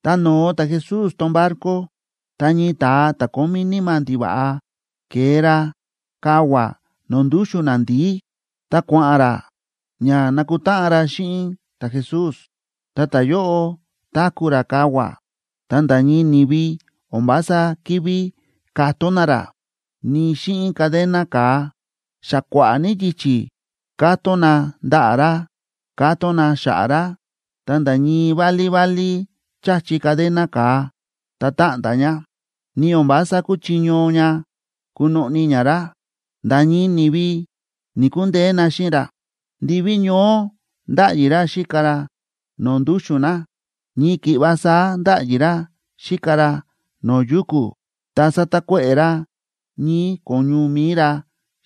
Tá no̱o ta̱Jesús tón barco, ta ñii ta̱a ta̱ kómí níma̱ ndiva̱ꞌa ke̱e ra kavua̱ no̱o̱ ndúxu̱n nandi̱í, ta kua̱ꞌa̱n ra ña nakutáꞌan ra xíꞌin ta̱Jesús. Ta ta̱yóꞌo táku̱ ra kavua̱, ta nda̱ ñii ni̱vi o̱n vása ki̱ví katón na ra, ni xíꞌin cadena ka̱a. Xa kua̱ꞌa̱ ní yichi̱ kátón na ndaꞌa̱ ra, kátón na xa̱ꞌa̱ ra, ta̱nda̱ ñii válí válí cháchi cadena ka̱a, ta táꞌnda̱ ña, ni o̱n vása kúchiño ña kunoꞌni ña ra. Nda̱ ñii ni̱vi ni̱‑kundeé na xíꞌin ra. Ndiví ñoó ndáꞌyi ra xíka ra no̱o̱ ndúxu̱n na, ñii ki̱ꞌva saá ndáꞌyi ra xíka ra no̱o̱ yuku̱, ta sátakuéꞌe̱ ra ñii̱ ko̱ñu mi̱i ra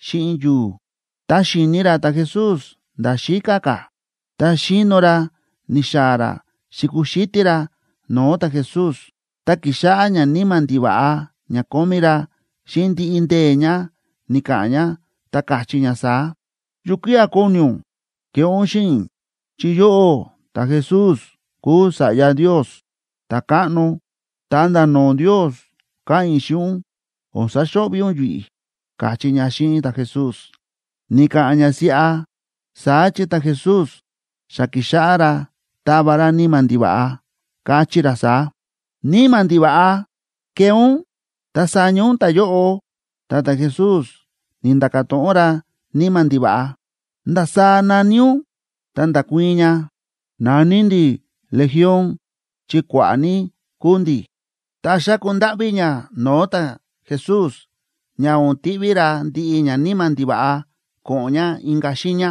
xíꞌin yu̱u̱. Tá xi̱ni ra ta̱Jesús nda̱ xíká ka̱, ta xíno ra ni̱xaa̱ ra xi̱kuxítí ra no̱o̱ ta̱Jesús. Ta ki̱xáꞌá ñaníma̱ ndiva̱ꞌa ña kómí ra xíꞌin ndiꞌi ndee̱ ña ni̱ka̱ꞌa̱n ña, ta káchí ña saá: ―¿Yukía̱ kóni ún keꞌé ún xíꞌin i̱? Chi yóꞌó ta̱Jesús kúu Sa̱ꞌya Ndios ta̱káꞌno. Ta nda̱ no̱o̱ Ndios káꞌa̱n i̱ xíꞌin ún, o̱n saxo̱ꞌvi̱ ún yi̱ꞌi̱ ―káchí ña xíꞌin ta̱Jesús. Ni̱ka̱ꞌa̱n ña siꞌa, saá chi ta̱Jesús xa ki̱xáꞌá ra táva ra níma̱ ndiva̱ꞌa, káchí ra saá: ―¡Níma̱ ndiva̱ꞌa, kee ún ta saña ún ta̱yóꞌo! Ta ta̱Jesús ni̱nda̱ka̱ to̱ꞌon ra níma̱ ndiva̱ꞌa: ―¿Ndasaá na̱ní ún? Ta nda̱kuii̱n ña: ―Na̱ní ndi̱ Legión chi kua̱ꞌa̱ ní kúu ndi̱. Ta xáku ndáꞌví ña no̱o̱ ta̱Jesús ña o̱n tiꞌví ra ndiꞌi ñaníma̱ ndiva̱ꞌa ko̱ꞌo̱n ña inka̱ xiiña.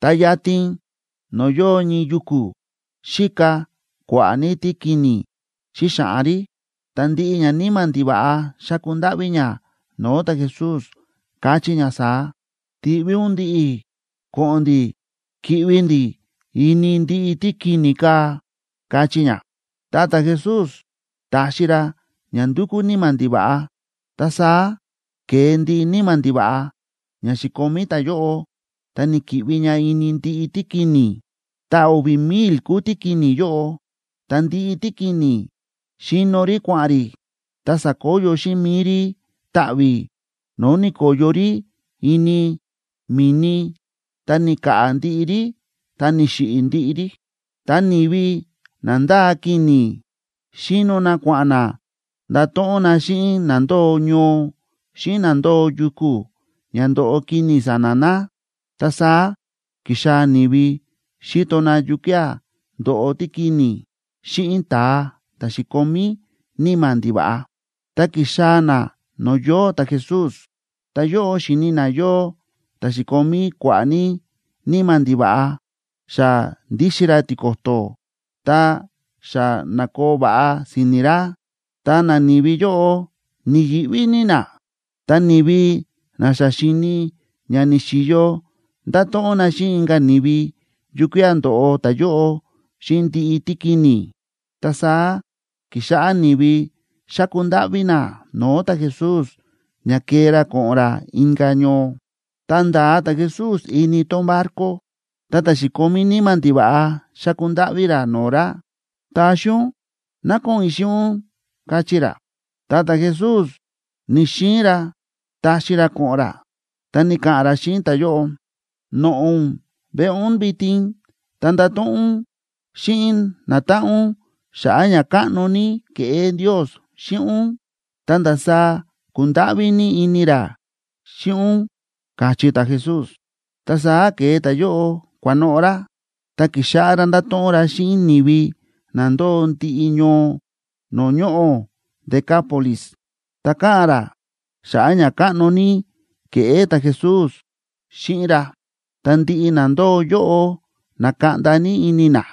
Ta yatin no̱o̱ yóo ñii yuku̱, xíka kua̱ꞌa̱ ní tíkini̱ xíxaꞌan rí. Ta ndiꞌi ñaníma̱ ndiva̱ꞌa xa̱ku ndáꞌví ña no̱o̱ ta̱Jesús, káchí ña saá: ―Tiꞌví ún ndi̱ꞌi̱ ko̱ꞌo̱n ndi̱ ki̱ꞌvi ndi̱ ini ndiꞌi tíkini̱ kaa̱ ―káchí ña. Ta ta̱Jesús ta̱xi ra ña ndu̱kú níma̱ ndiva̱ꞌa. Ta saá ke̱e ndiꞌi níma̱ ndiva̱ꞌa ña xi̱komí ta̱yóꞌo, ta ni̱ki̱ꞌvi ña ini ndiꞌi tíkini̱. Ta o̱vi̱ mil kúu tíkini̱ yóꞌo. Ta ndiꞌi tíkini̱ xi̱no rí kua̱ꞌa̱n rí, ta sa̱koyo xíꞌin mi̱i rí taꞌvi̱, no̱o̱ ni̱ko̱yo rí ini mi̱ni, ta ni̱ka̱ꞌa̱ ndiꞌi rí ta ni̱xiꞌi̱ ndiꞌi rí. Ta ni̱vi na ndáa kini̱ xíno na kua̱ꞌa̱n na ndato̱ꞌon na xíꞌin na ndóo ñoo xíꞌin na ndóo yuku̱, ña ndo̱ꞌo kini̱ sa̱na̱ na. Ta saá ki̱xaa̱ ni̱vi xíto na yukía̱ ndo̱ꞌo tíkini̱ xíꞌin ta̱a ta̱ xi̱komí níma̱ ndiva̱ꞌa. Ta ki̱xaa̱ na no̱o̱ yóo ta̱Jesús, ta yóꞌo xi̱ni na yóo ta̱ xi̱komí kua̱ꞌa̱ ní níma̱ ndiva̱ꞌa, xa ndíxin ra tiko̱to̱, ta xa na̱koo va̱ꞌa si̱ni̱ ra. Ta nani̱vi yóꞌo ni̱yi̱ꞌví ní na. Ta ni̱vi na xa xi̱ni ña ni̱xi̱yo nda̱to̱ꞌon na xíꞌin inka̱ ni̱vi yukía̱ ndo̱ꞌo ta̱yóꞌo xíꞌin ndiꞌi tíkini̱. Ta saá ki̱xáꞌá ni̱vi xáku ndáꞌví na no̱o̱ ta̱Jesús ña kee ra ko̱ꞌo̱n ra inka̱ ñoo. Tá nda̱a ta̱Jesús ini tón barco, ta ta̱ xi̱komí níma̱ ndiva̱ꞌa xa̱ku ndáꞌví ra no̱o̱ ra: ―Taxi ún ná ko̱ꞌo̱n i̱ xíꞌin ún ―káchí ra. Ta ta̱Jesús ni̱‑xiin ra taxi ra ko̱ꞌo̱n ra, ta ni̱ka̱ꞌa̱n ra xíꞌin ta̱yóꞌo: ―Noꞌo̱ ún veꞌe ún vitin, ta ndato̱ꞌon ún xíꞌin natáꞌan ún xa̱ꞌa̱ ñakáꞌno ní ke̱ꞌé Ndios xíꞌin ún, ta ndasaá ku̱ndáꞌví ní ini ra xíꞌin ún ―káchí ta̱Jesús. Ta saá ke̱e ta̱yóꞌo kua̱noꞌo̱ ra, ta ki̱xáꞌá ra ndáto̱ꞌon ra xíꞌin ni̱vi na ndóo ndiꞌi ñoo no̱o̱ ñoꞌo̱ Decápolis, ta káꞌa̱n ra xa̱ꞌa̱ ñakáꞌno ní ke̱ꞌé ta̱Jesús xíꞌin ra. Ta ndiꞌi na ndóo yóꞌo na̱kaꞌnda ní ini na.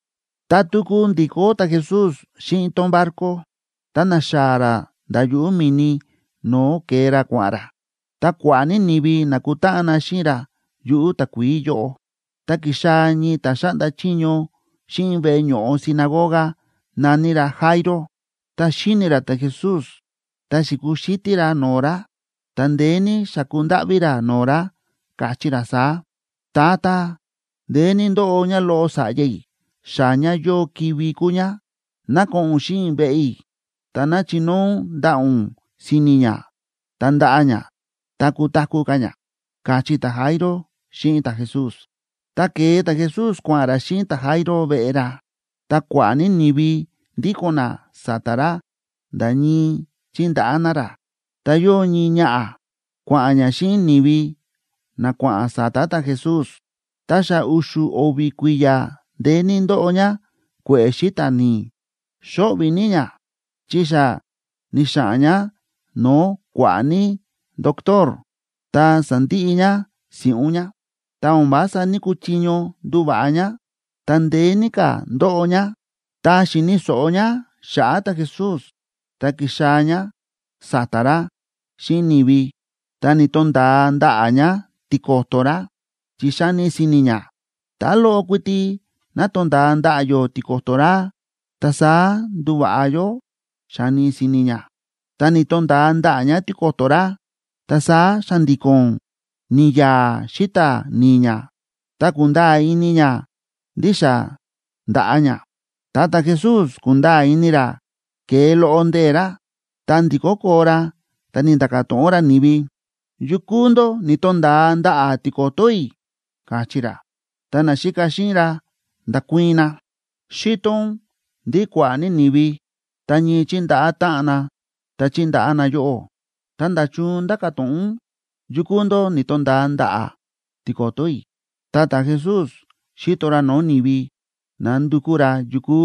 Tá tuku ndi̱kó ta̱Jesús xíꞌin tón barco, ta na̱xaa̱ ra nda̱ yuꞌu̱ mi̱ni no̱o̱ ke̱e ra kua̱ꞌa̱n ra, ta kua̱ꞌa̱ ní ni̱vi na̱kutáꞌan na xíꞌin ra yuꞌu̱ takuií yóꞌo. Ta ki̱xaa̱ ñii ta̱ xáꞌnda chiño xíꞌin veꞌe ño̱ꞌo sinagoga, na̱ní ra Jairo. Ta xi̱ni ra ta̱Jesús, ta xi̱kuxítí ra no̱o̱ ra, ta ndeé ní xa̱ku ndáꞌví ra no̱o̱ ra, káchí ra saá: ―Tata, ndeé ní ndóꞌo ñáloꞌo sa̱ꞌya i̱, xa ñá yóo kivi̱ kúu ñá. Ná ko̱ꞌo̱n ún xíꞌin i̱ veꞌe i̱, ta ná chinóo ún ndaꞌa̱ ún si̱ni̱ ñá, ta ndaꞌa ñá ta kutaku̱ ka̱ ñá ―káchí ta̱Jairo xíꞌin ta̱Jesús. Ta ke̱e ta̱Jesús kua̱ꞌa̱n ra xíꞌin ta̱Jairo veꞌe ra. Ta kua̱ꞌa̱ ní ni̱vi ndíko̱n na sa̱ta̱ ra nda̱ ñii chíndaꞌá na ra. Ta yóo ñii ñaꞌa̱ kua̱ꞌa̱n ñá xíꞌin ni̱vi na kua̱ꞌa̱n sa̱ta̱ ta̱Jesús, ta xa u̱xu̱ o̱vi̱ kui̱ya̱ ndeé ní ndóꞌo ñá kue̱ꞌe̱ xíta̱ ni̱i̱. Xóꞌvi̱ ní ñá chi xa ni̱xa̱ꞌa̱n ñá no̱o̱ kua̱ꞌa̱ ní ndotor, ta sa̱ndiꞌi ñá si̱ꞌún ñá. Ta o̱n vása ní‑kuchiño nduva̱ꞌa ñá, ta ndeé ní ka̱ ndóꞌo ñá. Ta xi̱ni̱ so̱ꞌo ñá xa̱ꞌa̱ ta̱Jesús, ta ki̱xaa̱ ñá sa̱ta̱ ra xíꞌin ni̱vi, ta ni̱to̱nda̱a ndaꞌa̱ ñá tiko̱to̱ ra, chi xa̱ni si̱ni̱ ñá: “Tá loꞌo kuiti ná tonda̱a ndaꞌa̱ yó tiko̱to̱ ra, ta saá nduva̱ꞌa yó”, xáni si̱ni̱ ñá. Tá ni̱to̱nda̱a ndaꞌa̱ ñá tiko̱to̱ ra, ta saá xa̱ndi̱ko̱n ni̱ya̱a̱ xíta̱ ni̱i̱ ñá, ta ku̱nda̱a̱ ini ñá ndí xa nda̱ꞌa ñá. Ta ta̱Jesús ku̱nda̱a̱ ini ra ke̱e loꞌo ndee̱ ra. Ta ndi̱kó koo ra, ta ni̱nda̱ka̱ to̱ꞌon ra ni̱vi: ―¿Yukú ndó ni̱to̱nda̱a ndaꞌa̱ tiko̱to̱ i̱? ―káchí ra. Ta naxíka xíꞌin ra nda̱kuii̱n na: ―Xíto ún ndí kua̱ꞌa̱ ní ni̱vi ta ñii chíndaꞌá táꞌan na ta chíndaꞌá na yóꞌó, ta, ¿nda̱chun ndáka̱ to̱ꞌon ún: “Yukú ndó ni̱to̱nda̱a ndaꞌa̱ tiko̱to̱ i̱”? Ta ta̱Jesús xi̱to ra no̱o̱ ni̱vi nándukú ra yukú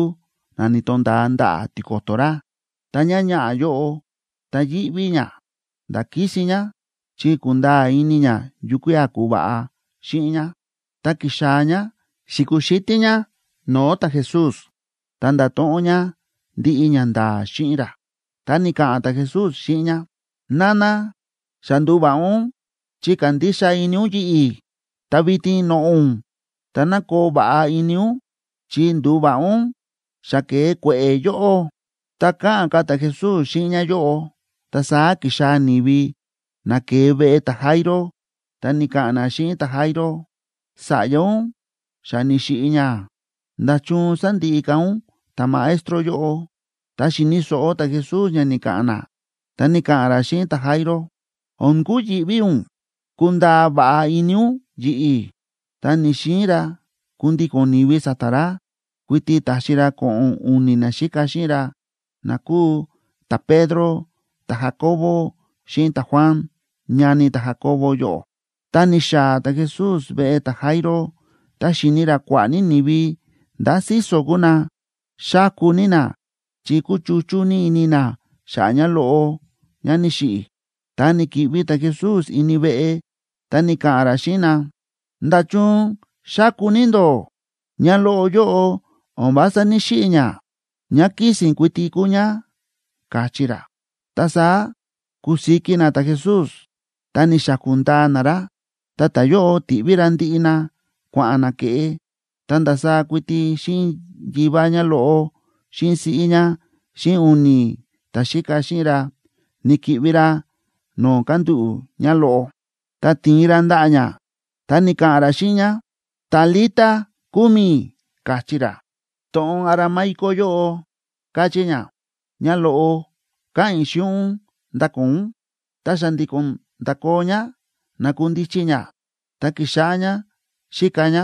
na ni̱to̱nda̱a ndaꞌa̱ tiko̱to̱ ra. Ta ñáñaꞌa̱ yóꞌo, ta yíꞌví ñá nda̱ kísin ñá, chi ku̱nda̱a̱ ini ñá yukía̱ ku̱va̱ꞌa xíꞌin ñá, ta ki̱xaa̱ ñá xi̱kuxítí ñá no̱o̱ ta̱Jesús, ta nda̱to̱ꞌon ñá ndiꞌi ñanda̱a̱ xíꞌin ra. Ta ni̱ka̱ꞌa̱n ta̱Jesús xíꞌin ñá: ―Nana, xa ndu̱va̱ꞌa ún chi kándixa ini ún yi̱ꞌi̱. Ta vitin noꞌo̱ ún, ta ná koo va̱ꞌa ini ún chi ndu̱va̱ꞌa ún, xa ke̱e kue̱ꞌe̱ yóꞌó. Tá káꞌa̱n ka̱ ta̱Jesús xíꞌin ñáyóꞌo, ta saá ki̱xaa̱ ni̱vi na ke̱e veꞌe ta̱Jairo, ta ni̱ka̱ꞌa̱n na xíꞌin ta̱Jairo: ―Sa̱ꞌya ún xa ni̱xiꞌi̱ ñá. ¿Nda̱chun sándiꞌi ka̱ ún ta̱Maestro yóꞌo? Ta xi̱ni̱ so̱ꞌo ta̱Jesús ña ni̱ka̱ꞌa̱n na, ta ni̱ka̱ꞌa̱n ra xíꞌin ta̱Jairo: ―O̱n kuyi̱ꞌví ún. Kundaa va̱ꞌa ini ún yi̱ꞌi̱. Ta ni̱‑xiin ra kundíko̱n ni̱vi sa̱ta̱ ra, kuiti ta̱xi ra ko̱ꞌo̱n u̱ni̱ naxíka xíꞌin ra na kúu ta̱Pedro, ta̱Jacobo, xíꞌin ta̱Juan, ñani ta̱Jacobo yóꞌo. Ta ni̱xaa̱ ta̱Jesús veꞌe ta̱Jairo, ta xi̱ni ra kua̱ꞌa̱ ní ni̱vi ndá síso̱ kúu na, xáku ní na chi kúchuchú ní ini na xa̱ꞌa̱ ñáloꞌo ñá ni̱xiꞌi̱. Ta ni̱ki̱ꞌvi ta̱Jesús ini veꞌe, ta ni̱ka̱ꞌa̱n ra xíꞌin na: ―¿Nda̱chun xáku ní ndó? Ñáloꞌo yóꞌo o̱n vása ní‑xiꞌi̱ ñá, ñá kísi̱n kuiti kúu ñá ―káchí ra. Ta saá ku̱siki na ta̱Jesús ta ni̱xaku̱ ndaa na ra. Ta ta̱yóꞌo ti̱ꞌví ra ndiꞌi na kua̱ꞌa̱n na ke̱ꞌe, ta ndasaá kuiti xíꞌin yivá ñáloꞌo xíꞌin siꞌí ñá xíꞌin u̱ni̱ ta̱xíka xíꞌin ra, ni̱ki̱ꞌvi ra no̱o̱ kándúꞌu̱ ñáloꞌo. Ta ti̱in ra ndaꞌa̱ ñá, ta ni̱ka̱ꞌa̱n ra xíꞌin ñá: ―Talita cumi ―káchí ra. To̱ꞌon aramaico yóꞌo káchí ña: Ñáloꞌo, káꞌa̱n i̱ xíꞌin ún, ndakoo ún. Ta xa̱ndi̱ko̱n nda̱koo ñá, na̱kundichi ñá, ta ki̱xáꞌá ñá xíka ñá,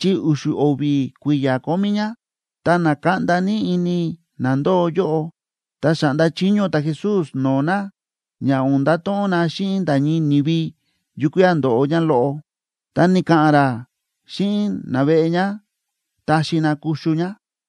chi u̱xu̱ o̱vi̱ kui̱ya̱ kómí ñá. Ta na̱kaꞌnda ní ini na ndóo yóꞌo. Ta xa̱ꞌnda chiño ta̱Jesús no̱o̱ na ña o̱n ndato̱ꞌon na xíꞌin nda̱ ñii ni̱vi yukía̱ ndo̱ꞌo ñáloꞌo, ta ni̱ka̱ꞌa̱n ra xíꞌin naveꞌe ñá taxi na kuxu ñá.